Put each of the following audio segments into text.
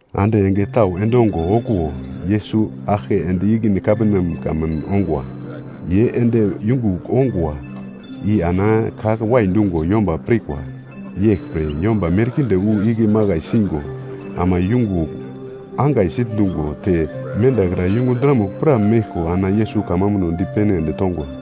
Ande enge tau endongo okuwo, Yesus aglke ende ikine Kaperneam kamun ongwa. Ye ende yungugl ongwa i ana ka wai dungo yomba pirkwa. Yeglpre, yomba merkinde wu igle makai singo ama yungugl angai sitndungo te mendakra yungu dramugl pra meglko ana Yesus kamambuno dipene ende tongwa.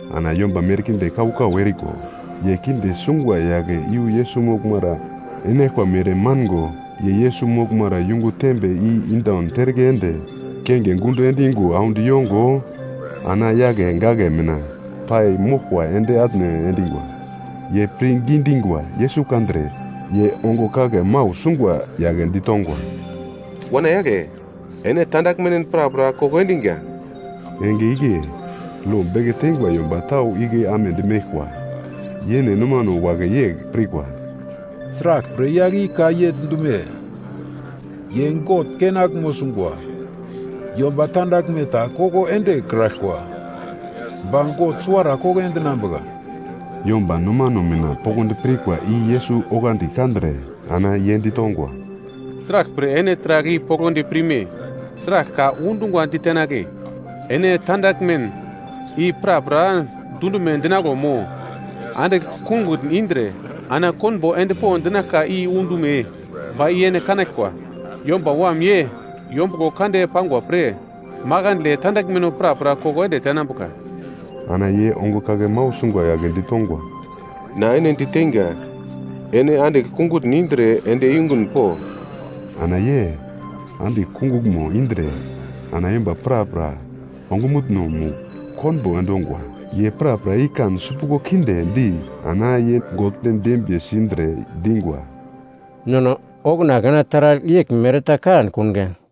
Ana yomba merkinde kau-kau eriko, ye kinde sungwa yagle iyu Yesus moglmara enaglkwa mere mango, ye Yesus moglmara yungu tembe i indaun terke ende kenge gundo endingwa audi yongo, ana yagle gagle mina pai moglko ende atne endingwa. Ye pirngi dingwa Yesus kandre, ye ongo kagle mau sungwa yagle ditongwa, “Wana yagle, ene tandaglmen prapra koko endiga.” Enge igle, lo beke teingwa yomba tau igle amedi meglkwa, yene nomano wagle yegl pirkwa, “Sraglpre yagl i ka yegl dume? Ye God kenaglmo sungwa! Yomba tandaglme ta koko endekraglkwa, ba God suwara koko endinambuka.” Yomba nomano mina poglodi pirkwa i Yesus oglandi kandre ana ye ditongwa, “Sraglpre ene taragl i poglodi pirme? Sragl ka undungwa ditenagle, ‘Ene tandaglmen i prapra dundume dinaglo’ mo ‘Andigl kungutn indre, ana konbo ende po’ dinaglka i undume? Ba i ene kanaglkwa. Yomba Wam ye yombuglo kande pangwa pre, makandle tandaglmeno prapra koko ende tenambuka.” Ana ye ongo kagle mau sungwa yagle ditongwa, “Na ene diteinga, ene andigl kungutn indre ende yungun po.” Ana ye andigl kunguglmo indre ana yomba prapra ongumutno-mugl konbo endongwa. Ye prapra i kan sipuglo kinde di ana ye God dembiye sindre dingwa, “Nono okuna taragl yeglmere ta kankunga!”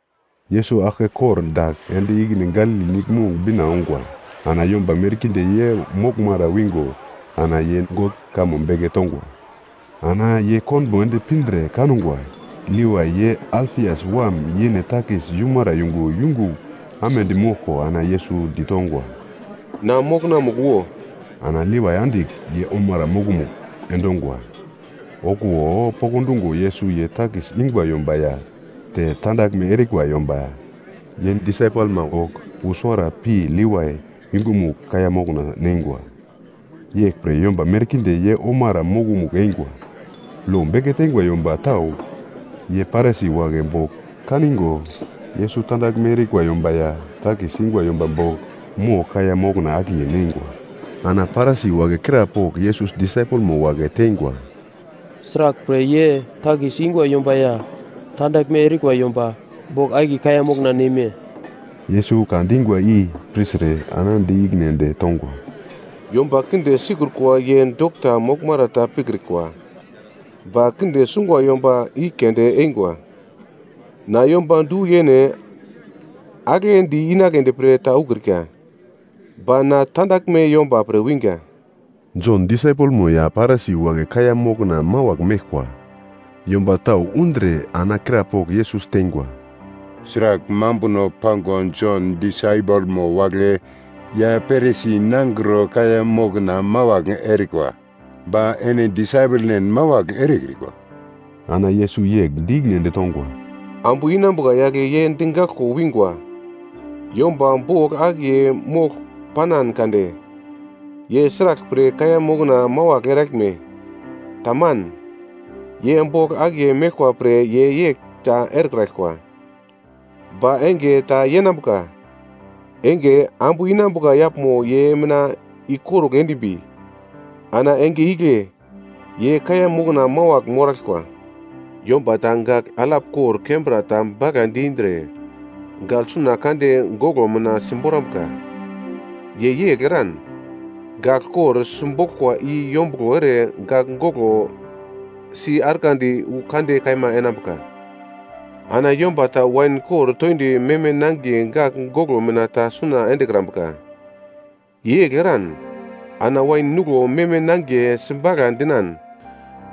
Yesus aglke kordagl ende ikine Galili Niglmong bina ongwa. Ana yomba merkinde ye moglmara wingo ana ye God kamo beke tongwa. Ana ye konbo ende pindre kangwa, Levai, ye Alfias wam yene takis yumara yungu yungugl amedi moglko ana Yesus ditongwa, “Na mokonamugl wo.” Ana Levai andigl ye omara mokomugl endongwa. Okuwo pokndungo Yesus ye takis ingwa yomba ya te tandaglme erikwa yomba, ye disaipelma bogl wu suwara pi Levai yungumugl kaiya mokna neingwa. Yeglpre yomba merkinde ye omara mokomugl eingwa. Lo beke teingwa yomba tau ye Parisi wagle bogl kaningo Yesus tandaglme erikwa yomba ya takis ingwa yomba bogl mogl kaiya mokna akiye neingwa. Ana Parisi wagle krapogl Yesus disaipelmo wagle teingwa, “Sraglpre ye takis ingwa yomba ya tandaglme erikwa yomba bogl akiye kaiya mokna neme?” Yesus ka dingwa i pirtre ana di ikine ende tongwa, “Yomba kinde sikrukwa ye dokta moglmara ta pikrikwa, ba kinde sungwa yomba i keunde eingwa. Na yomba du-yene aglendi inagledi pre ta ukrika. Ba na tandaglme yomba pre winga.” Jon disaipelmo ya Parisi wagle kaiya mokna mawagl meglkwa. Yomba tau undre ana krapogl Yesus teingwa, “Sragl mambuno pango Jon disaipelmo wagle ya Parisi nangro kaiya mokna mawagl erikwa. Ba ene disaipelnen mawagl erekrikwa?” Ana Yesus yegl di ikine ende tongwa, “Ambu inambuka yagle ye digaglko wingwa yomba bogl akiye mogl panan kade, ye sraglpre kaiya mokna mawagl eraglme? Taman. Ye bogl akiye meglkwa pre ye yegl ta erekraglkwa. Ba enge ta yenambuka enge, ambu inambuka yaglmo ye mina ikorugl endimbi, ana enge igle ye kaiya mokna mawagl moraglkwa. “Yomba ta gagl alap kor kembra ta bagladi indre, gagl suna kande goglo mina simborambuka. Ye yegl eran, gagl kor simboglkwa i yombuglo ere gagl goglo si arglandi wu kande kaima enambuka. Ana yomba ta wain kor toindi meme nangiye gagl goglo mina ta suna endekrambuka. Ye yegl eran ana wain nuglo meme nangiye sibagla dinan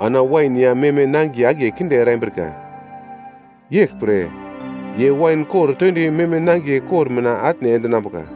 ana wain ya meme nangiye akiye kinde erambrika. Yeglpre, ye wain kor toindi meme nangiye kor mina atne endinambuka.”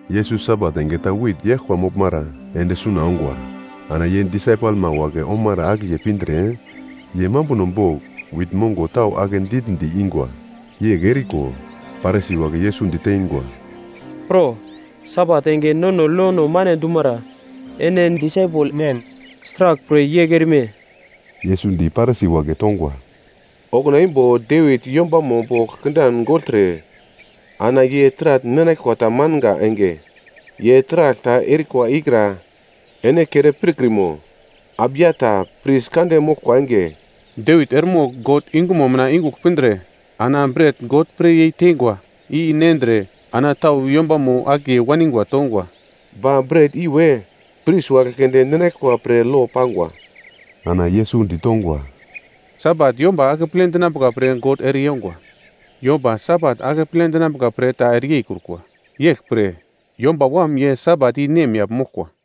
Yesus Sabat enge ta wit yaglkwa moglmara ende suna ongwa. Ana ye disaipelma wagle omara akiye pindre, ye mambuno bogl wit mongo tau ake ditndi ingwa. Yegl eriko, Parisi wagle Yesus diteingwa, “Pro, Sabat enge nono lono mane dumara ene disaipelnen sraglpre yegl erime?” Yesus di Parisi wagle tongwa, “Okuna imbo Devit yombamo bogl kindan gogltre ana ye taragl ninaglkwa tamanga enge, ye taragl ta erikwa ikra ene kere pirkrimo? Abiatar pris kande moglkwa enge, Devit eremogl God yungumo mina yungugl pindre ana bret God pre yei teingwa i nendre ana tau yombamo akiye waningwa tongwa. Ba bret i we pris wagle keunde ninaglkwa pre lo pangwa.” Ana Yesus ditongwa, “Sabat yomba akeple dinambuka pre God ere yongwa. Yomba Sabat akeple dinambuka pre ta ere yeikrukwa. Yeglpre Yomba Wam ye Sabat i nemyagl moglkwa.”